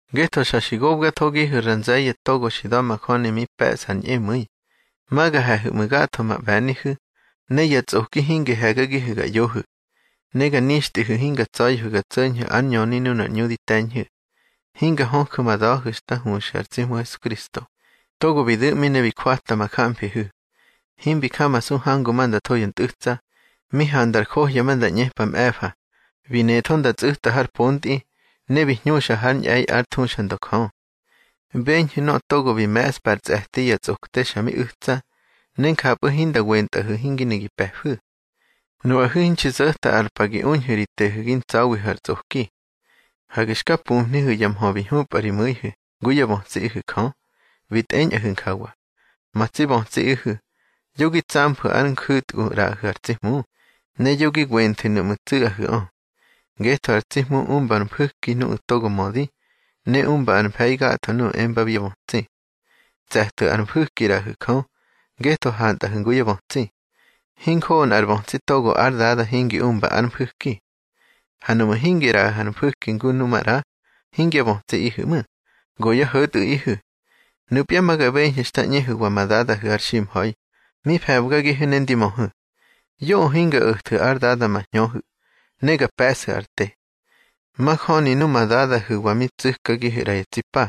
Ngetho xa xi gokathogihu̱ ra nze̱ye̱ togo xi da̱majöni mi pe̱ꞌsa ar ñꞌemu̱i, ma ga he̱hu̱ ꞌmu̱ gatho ma ꞌbe̱nihu̱, ne ya tsꞌoki hingi he̱gagihu̱ ga ꞌyohu̱. Ne ga nixtꞌihu̱ hinga tsa̱ya̱hu̱ ga tso̱ñhu̱ ár ñöni nunar ꞌñu di te̱ñhu̱. Hinga höju̱ ma da̱hu̱ xta huxu̱ ar tsi Hmu Hesukristo, togo bi du̱ꞌmi ne bi jwatka ma jamfihu̱. Himbi jamasu hangu ma nda tho ya ntꞌu̱tsa, mi handar johya ma nda ꞌñepa mꞌe̱fa, bi netho nda tsꞌu̱ta har pontꞌi, ne bi hñúxa hár ñꞌe̱i ár thuxandö Jö. Beñhu̱ nöꞌö togo bi me̱ꞌspa ar tse̱ti ya tsꞌokte xa mi u̱tsa, ne njapꞌu̱ hinda wentꞌahu̱ hingi ne gi pe̱fu̱. Nuꞌahu̱ hinxi zo̱ta ar pa gi uñhu̱ ri tehu̱ gi ntsa̱wihu̱ ar tsꞌoki. Hage xka pumhnihu̱ ya mhö bi hñupꞌa ri mu̱ihu̱ ngu yá bötsiꞌihu̱ Jö, bi tꞌeñꞌahu̱ njawa: Ma tsi bötsiꞌihu̱, yo gi tsamfu̱ ár nju̱tgu ꞌraꞌahu̱ ar tsi Hmu, ne yo gi wenthu̱ nuꞌmu̱ tsu̱ꞌahu̱ꞌö. Ngetho ar tsi Hmu umba ár mfu̱ki nuꞌu̱ togo mödi, ne umba ár mfe̱i gatho nuꞌu̱ embabi yá bötsi. Tse̱thu̱ ar mfu̱ki ꞌraꞌahu̱ Jö, ngetho hantꞌahu̱ ngu yá bötsi. Hinjoꞌo nꞌar bötsi togo ár dada hingi umba ár mfu̱ki. Ha nuꞌmu̱ hingi ꞌraꞌahu̱ ar mfu̱ki ngu nu maꞌra, hingyá bötsiꞌihu̱ ꞌmu̱, go yá ho̱tꞌu̱ꞌihu̱. Nupya ma ga beñhu̱ xta ꞌñehu̱wa ma dadahu̱ har ximha̱i, mi fe̱bgagihu̱ ne ndi möhu̱. Yoꞌö hinga o̱thu̱ ár Dada ma hñöhu̱, ne ga pe̱ꞌsu̱ ar te. Majöni numa dadahu̱wa mi tsu̱kagihu̱ ꞌra ya tsi pa,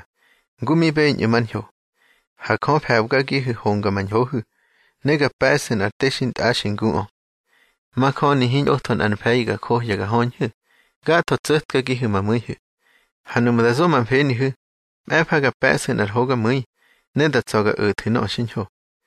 ngu mi beñꞌu̱ mar ñho. Ha Jö fe̱bgagihu̱ homga ma ñhohu̱, ne ga pe̱ꞌsu̱ nꞌar te xintꞌaxi nguꞌö. Majöni hiñꞌotho nꞌar mfe̱i ga johya ga höñhu̱, gatho tso̱tkagihu̱ ma mu̱ihu̱. Ha nuꞌmu̱ da zo ma mfenihu̱, mꞌe̱fa ga pe̱ꞌsu̱ nꞌar hogamu̱i, ne da tsa̱ ga o̱thu̱ nöꞌö xiñho.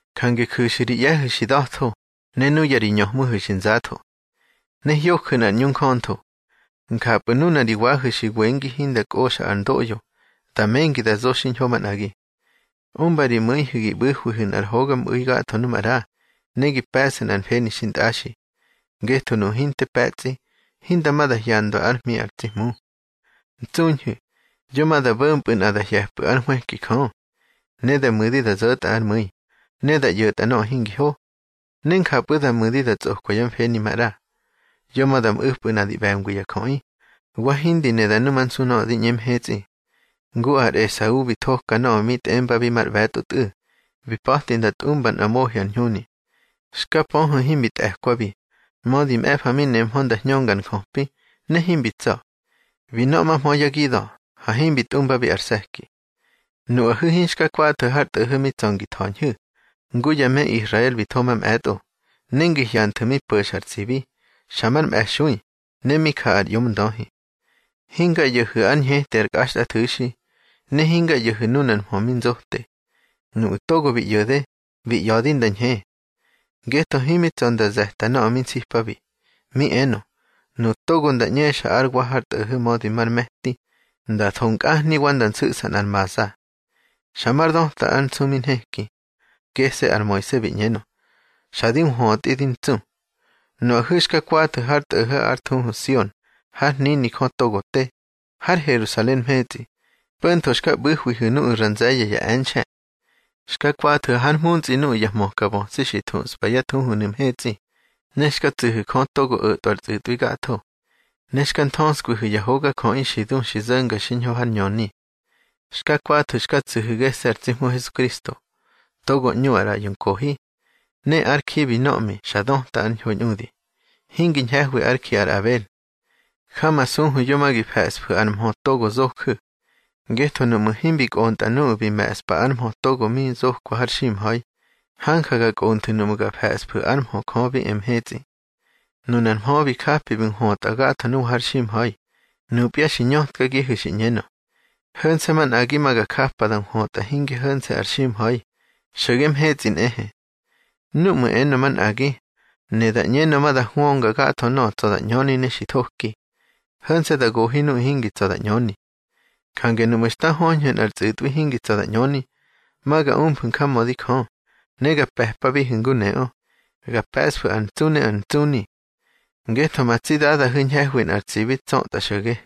Jange ju̱xu̱ ri ꞌye̱hu̱ xi da̱tho, ne nuya ri ñöhmuhu̱ xi nzatho. Ne hyoju̱ nꞌar ꞌñu njöntho. Njapꞌu̱ nuna ri wahu̱ xi wengi hinda kꞌoxa ar ndoꞌyo, da mengi da zo xiñho manꞌagi. Umba ri mu̱ihu̱ gi ꞌbu̱hwihu̱ nꞌar hogamꞌu̱i gatho nu maꞌra, ne gi pe̱ꞌsu̱ nꞌar mfeni xintꞌaxi. Ngetho nuꞌu̱ hinte pe̱tsꞌi, hinda ma da hyandwa ár hmi ar tsi Hmu. Ntsuñhu̱, yo ma da bo̱mpꞌu̱ nꞌa da hye̱pꞌu̱ ár nhwëki Jö. Ne da mu̱di da zo̱tꞌa ár mu̱i, ne da ꞌyo̱tꞌa nöꞌö hingi ho. Ne njapꞌu̱ da mu̱di da tsꞌokwa yá mfeni maꞌra. Yo ma da mꞌu̱pꞌu̱ nꞌa di ꞌbe̱ngwi ya jöꞌi, wa hindi ne da numansu nöꞌö di ꞌñe mhetsꞌi. Ngu ar Esau bi thoka nöꞌö mi tꞌembabi mar ꞌbe̱tꞌo tꞌu̱, bi pa̱ti nda tꞌumba nꞌa mohi ar ñhuni. Xka pöhu̱ himbi tꞌe̱kwabi, mödi mꞌe̱fa mi nemhö nda hñönga ar njöpi, ne himbi tsa̱. Bi nöꞌmahmö yá gida̱, ha himbi tꞌumbabi ar se̱ki. Nuꞌahu̱ hinxka kwathu̱ har tꞌo̱ho̱ mi tsa̱ ngi tha̱ñhu̱, ngu ya me Israel bi tho mamꞌe̱tꞌo, ne ngi hyanthu̱ mi po̱xa ar tsibi, xa mar mꞌe̱xui, ne mi ja ar ꞌyomndöhi. Hinga ꞌyo̱hu̱ ár ñheti ar kꞌaxtꞌathu̱xi, ne hinga ꞌyo̱hu̱ nunar mhö mi nzote. Nuꞌu̱ togo bi ꞌyo̱de bi ꞌya̱di nda ñhe. Ngetho himi tsa̱ nda ze̱ta nöꞌö mi nsipabi, mi enö: Nuꞌu̱ togo nda ꞌñexa ár wa har tꞌo̱ho̱ mödi mar me̱ti, nda tho nkꞌahni wa nda nsu̱ꞌsa nꞌar maza. Xa mar döta ár nsu mi nheki. Gese̱ ar Moise bi ꞌñenö: Xa di nhwötꞌi di ntsu. Nuꞌahu̱ xka kwathu̱ har tꞌo̱ho̱ ár thuhu Sion, hár hnini Jö togo te, har Herusalen mhetsꞌi, po̱ntho xka ꞌbu̱hwihu̱ nuꞌu̱ ra nze̱ye̱ ya e̱nxe̱. Xka kwathu̱ hár mhuntsꞌi nuꞌu̱ ya hmökabötsi xi thuꞌspa yá thuhunu̱ mhetsꞌi, ne xka tsu̱hu̱ Jö togo o̱tꞌwa ar tsꞌu̱tꞌwi gatho. Ne xka nthöskwihu̱ ya hogajöꞌi xi du xi zo̱nga xiñho hár ñöni. Xka kwathu̱ xka tsu̱hu̱ gese̱ ar tsi Hmu Hesukristo, togo ꞌñu ar ꞌraꞌyo nkohi. Ne ár ji bi nöꞌmi xa döta ar ñho ñꞌudi, hingi ñhe̱hwi ár ji ar Abel. Jamasuhu̱ yo ma gi fe̱ꞌsfu̱ ár mhö togo zoju̱. Ngetho nuꞌmu̱ himbi kꞌontꞌa nuꞌu̱ bi me̱ꞌspa ár mhö togo mi zokwa har ximha̱i, hanja ga kꞌonthu̱ nuꞌmu̱ ga fe̱ꞌsfu̱ ár mhö Jö bi e mhetsꞌi. Nunar mhö bi japi bi nhwötꞌa gatho nuwa har ximha̱i, nupya xi ñötkagihu̱ xi ꞌñenö: Ho̱nse̱ manꞌagi ma ga japa da nhwötꞌa hinge ho̱nse̱ ar ximha̱i, xo̱ge mhetsꞌi nꞌehe. Núꞌmu̱ enö, manꞌagi, ne da ꞌñenö ma da hwönga gatho nöꞌö tsa̱ da ꞌñöni ne xi thoki. Ho̱nse̱ da gohi nuꞌu̱ hingi tsa̱ da ꞌñöni. Jange nuꞌmu̱ xta höñhu̱ nꞌar tsꞌu̱tꞌwi hingi tsa̱ da ꞌñöni, ma ga umfu̱ njamödi Jö, ne ga pe̱pabihu̱ ngu neꞌö, ga pe̱ꞌsfu̱ ar ntsu ne ar ntsuni. Ngetho ma tsi Dadahu̱ ñhe̱hwi nꞌar tsibi tsötꞌa xo̱ge.